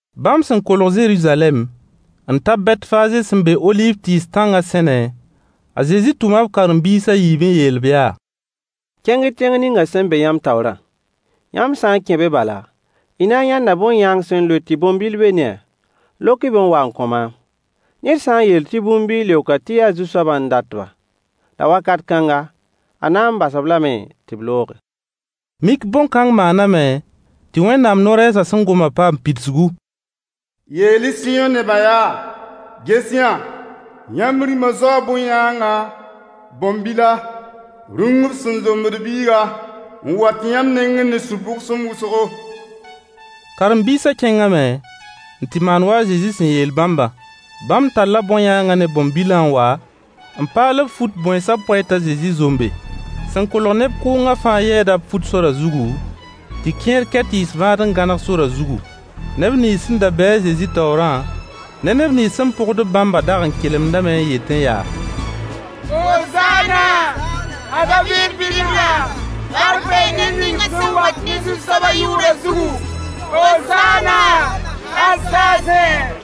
Bãmb sẽn kolg Zeruzalɛm n ta Bɛtfaaze sẽn be oliiv tɩɩs tãngã sẽne, a Zezi tʋma b karen-biis a yiib n yeel-b yaa: Kẽng-y tẽng ning sẽn be yãmb taoorã. Yãmb sã n kẽ be bala, y na n yãnda bõn-yãang sẽn loe tɩ bõn-bil be ne-a. Lok-y-b n wa n kõ maam. Ned sã n yeel tɩ bũmb bɩ y leok tɩ yaa Zu-soabã n dat-ba, la wakat kãnga, a na n bas-b lame tɩ b looge. Mik bõn-kãng maaname tɩ Wẽnnaam no-rɛɛsã sẽn gomã paam pidsgu: Yeel-y Sɩyõ nebã yaa: Ges-y-yã! Yãmb Rĩmã zaoo bõn-yãanga, bõn-bila, rũng b sẽn zombd biiga, n wat yãmb nengẽ ne sũ-bʋgsem wʋsgo. Karen-biisã kẽngame n tɩ maan wa a Zezi sẽn yeel bãmbã. Bãmb talla bõn-yãangã ne bõn-bilã n wa, n paal b fut bõensã poɛy t'a Zezi zombe. Sẽn kolg neb kʋʋngã fãa yɛɛda b fut sorã zugu, tɩ kẽer kɛ tɩɩs vãad n gãneg sorã zugu. Neb nins sẽn da be a Zezi taoorã ne neb nins sẽn pʋgd-b bãmbã dag n kelemdame n yetẽ yaa: Hozaana a David Bi-ribla! Bark bee ned ning sẽn wat ne Zu-soabã yʋʋrã zugu! Hozaana hal saasẽ.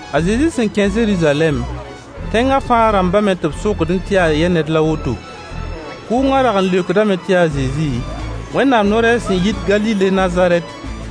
A Zezi sẽn kẽ Zeruzalɛm, tẽngã fãa rãmbame tɩ b sokdẽ tɩ yaa yɛ ned la woto? Kʋʋngã rag n leokdame tɩ yaa a Zezi, Wẽnnaam no-rɛɛs sẽn yit Galile Nazarɛt.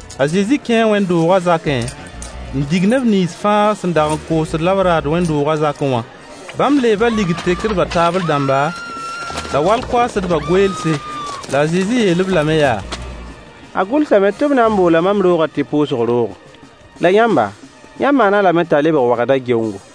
A Zezi kẽe wẽnd-doogã zakẽ n dig neb nins fãa sẽn dag n koosd la b raad wẽnd-doogã zakẽ wã. Bãmb leeba ligd tekdbã taabl dãmba la wall-koaasdbã goeelse. La a Zezi yeel-b lame yaa: A gʋlsame tɩ “b na n boola mam roogã tɩ pʋʋsg roogo.” La yãmba, yãmb maan-a lame t'a lebg wagda geongo.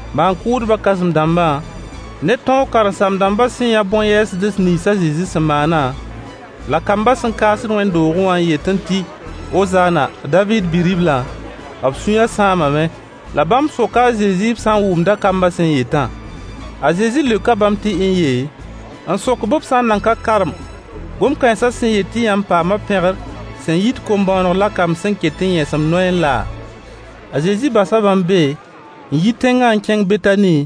Maan-kʋʋdbã kãsem-dãmbã ne tõog karen-saam-dãmbã sẽn yã bõn-yɛɛsds nins a Zezi sẽn maanã, la kambã sẽn kaasd Wẽnnaam doogẽ wã n yetẽ tɩ: “Hozaana a David Bi-riblã,” b sũyã sãamame. La bãmb soka a Zezi b sã n wʋmda kambã sẽn yetã. A Zezi leoka bãmb tɩ n-ye, n sok-b b sã n nan ka karem gom-kãensã sẽn yet tɩ yãmb paama pẽgr sẽn yit kom-bõoneg la kamb sẽn ket n yẽsemd noyẽ laa? A Zezi basa bãmb be n yi tẽngã n kẽng Betani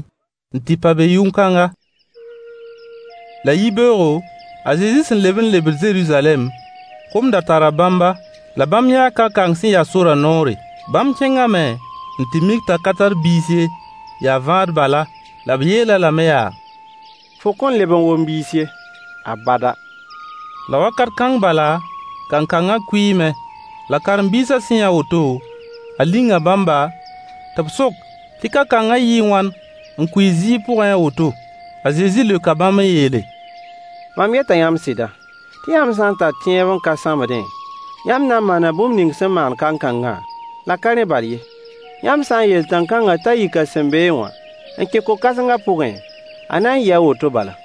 n tɩ pa be yʋʋn-kãnga. La yibeoogo, a Zezi sẽn leb n lebd Zeruzalɛm, kom da tara bãmba. La bãmb yãa kankang sẽn yas sorã noore. Bãmb kẽngame n tɩ mik t'a ka tar biis ye, yaa vãad bala. La b yeel-a lame yaa: Fo kõn leb n wom biis ye, abada. La wakat kãng bala kankangã kʋɩɩme. La karen-biisã sẽn yã woto, a linga bãmba, tɩ b sok tɩ kankangã yɩɩ wãn n kʋɩ zĩig pʋgẽ a woto? A Zezi leoka bãmb n yeele: Mam yeta yãmb sɩda, tɩ yãmb sã n tar tẽeb n ka sãmbdẽ, yãmb na n maana bũmb ning sẽn maan kankangã, la ka rẽ bal ye. Yãmb sã n yeel tãn-kãngã t'a yik a sẽn beẽ wã n kẽ ko-kãsengã pʋgẽ, a na n yɩɩ a woto bala.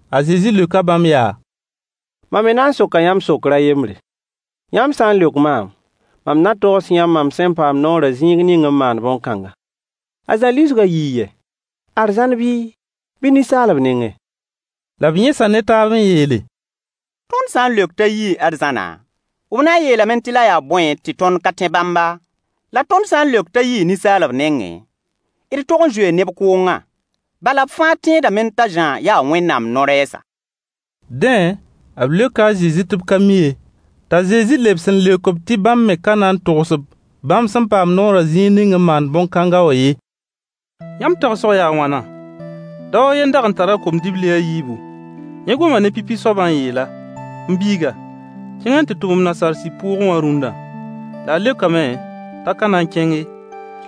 A Zezi leoka bãmb yaa: Mam me na n soka yãmb sokr a yembre. Yãmb sã n leok maam, mam na togs yãmb mam sẽn paam noorã zĩig ning n maand bõn-kãnga. A Zã lisgã yii yɛ? Arzãn bii, bɩ ninsaalb nengẽ? La b yẽsa ne taab n yeele: Tõnd sã n leok t'a yii arzãna, b na n yeelame tɩ la yaa bõe tɩ tõnd ka tẽ bãmba? La tõnd sã n leok t'a yii ninsaalb nengẽ, d tog n zoee neb kʋʋngã: Bala b fãa tẽedame t'a Zã yaa Wẽnnaam no-rɛɛsa. Dẽ, b leoka a Zezi tɩ b ka mi ye. T'a Zezi lebs n leok-b tɩ bãmb me ka na n togs-b bãmb sẽn paam noorã zĩig ning n maand bõn-kãnga wã ye. Yãmb tagsg yaa a wãna? Dao a yen n dag n tar a kom-dibli a yiibu. Yẽ goma ne pipi soabã n yeel-a: “M biiga, kẽng n tɩ tʋm m nasaar sib pʋʋgẽ wã rũnna.” La a leokame t'a ka na n kẽng ye.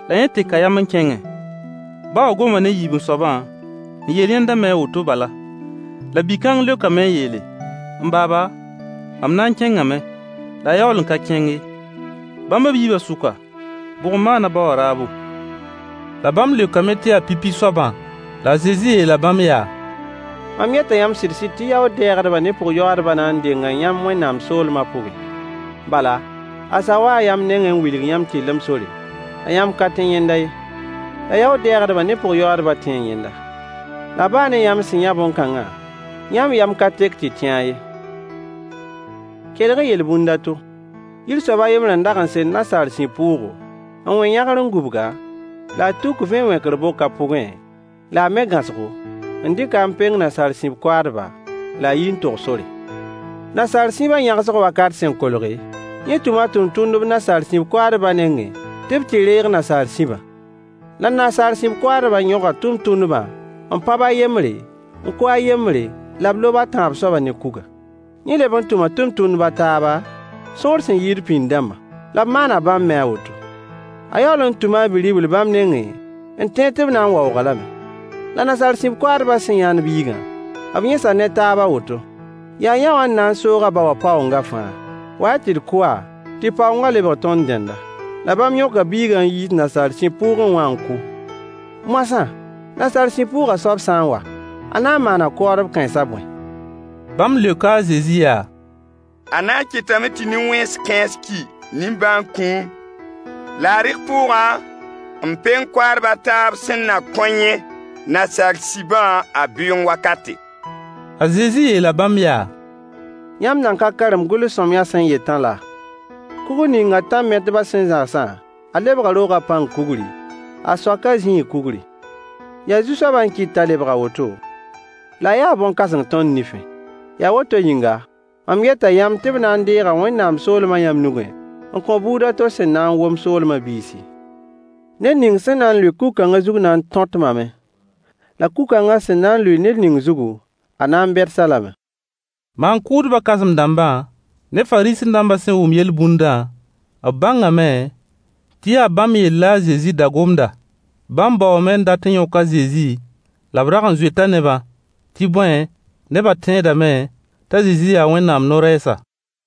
La yẽ teka yam n kẽnge. Ba wã goma ne yiib-n-soabã n yeel yẽnda me a woto bala. La bi-kãng leokame n yeele: “M baaba, mam na n kẽngame.” La a yaool n ka kẽng ye. Bãmb b yiibã sʋka, bʋg n maan a ba wã raabo? La bãmb leokame tɩ yaa pipi soabã. La a Zezi yeela bãmb yaa: Mam yeta yãmb sɩd-sɩd tɩ yaood-dɛɛgdbã ne pʋg-yoaadbã na n denga yãmb Wẽnnaam soolmã pʋgẽ. Bala, a Zã waa yãmb nengẽ n wilg yãmb tɩrlem sore, la yãmb ka tẽ yẽnda ye. La yaood-dɛɛgdbã ne pʋg-yoaadbã tẽe yẽnda. La baa ne yãmb sẽn yã bõn-kãngã, yãmb yam ka tek tɩ y tẽ-a ye. Kelg-y yel-bũnd a to. Yir soab a yembr n dag n sel nasaar sib pʋʋgo, n wẽ yãgr n gũbg-a, la a tuk vẽ wẽkr bok a pʋgẽ, la me gãosgo, n dɩk-a n peng nasaar sib koaadba, la a yi n tog sore. Nasaar sibã yãgsg wakat sẽn kolge, yẽ tʋma a tʋmtʋmdb nasaar sib koaadbã nengẽ tɩ b tɩ reeg nasaar sibã. La nasaar sib koaadbã yõga tʋmtʋmdbã n pãb a yembre, n kʋ a yembre la b lob a tãab soabã ne kuga. Yẽ leb n tʋma tʋmtʋmdb a taaba, sõor sẽn yɩɩd pĩnd dãmbã, la b maana bãmb me a woto. A yaool n tʋma a bi-ribl bãmb nengẽ n tẽed tɩ b na n waoog-a lame. La nasaar sib koaadbã sẽn yãnd biigã, b yẽsa ne taab a woto: Yaa yõwã n na n soog a ba wã paoongã fãa. Wa-y tɩ d kʋ-a tɩ paoongã lebg tõnd tẽnda. La bãmb yõka biigã n yiis nasaar sib pʋʋgẽ wã n kʋ. Moasã, nasaar sib pʋʋgã soab sã n wa, a na n maana koaadb kãens bõe? Bãmb leoka a Zezi yaa: A na n kɩtame tɩ nin-wẽns kãens ki nimbãan-kũum, la a rɩk pʋʋgã n peng koaadb a taab sẽn na kõ yẽ nasaar sibã a bɩʋʋng wakate. A Zezi yeela bãmb yaa: Yãmb nan ka karem gʋls-sõamyã sẽn yetã laa? “Kugr ning tãn-metbã sẽn zãgsã, a lebga roogã pãng kugri, a soakã zĩig kugri. Yaa Zu-soabã n kɩt t'a lebg a woto, la a yaa bõn-kãseng tõnd nifẽ.” Yaa woto yĩnga mam yeta yãmb tɩ b na n deega Wẽnnaam soolmã yãmb nugẽ n kõ buud a to sẽn na wom soolmã biisi. [ Ned ning sẽn na n lʋɩ kug-kãngã zug na n tõtmame. La kug-kãngã sẽn na n lʋɩ ned ning zugu, a na n beds-a lame.] Maan-kʋʋdbã kãsem-dãmbã ne Fariisẽ-dãmbã sẽn wʋm yel-bũndã, b bãngame tɩ yaa bãmb yell la a Zezi da gomda. Bãmb baoome n dat n yõk a Zezi la b rag n zoeta nebã, tɩ bõe, nebã tẽedame t'a Zezi yaa Wẽnnaam no-rɛɛsa.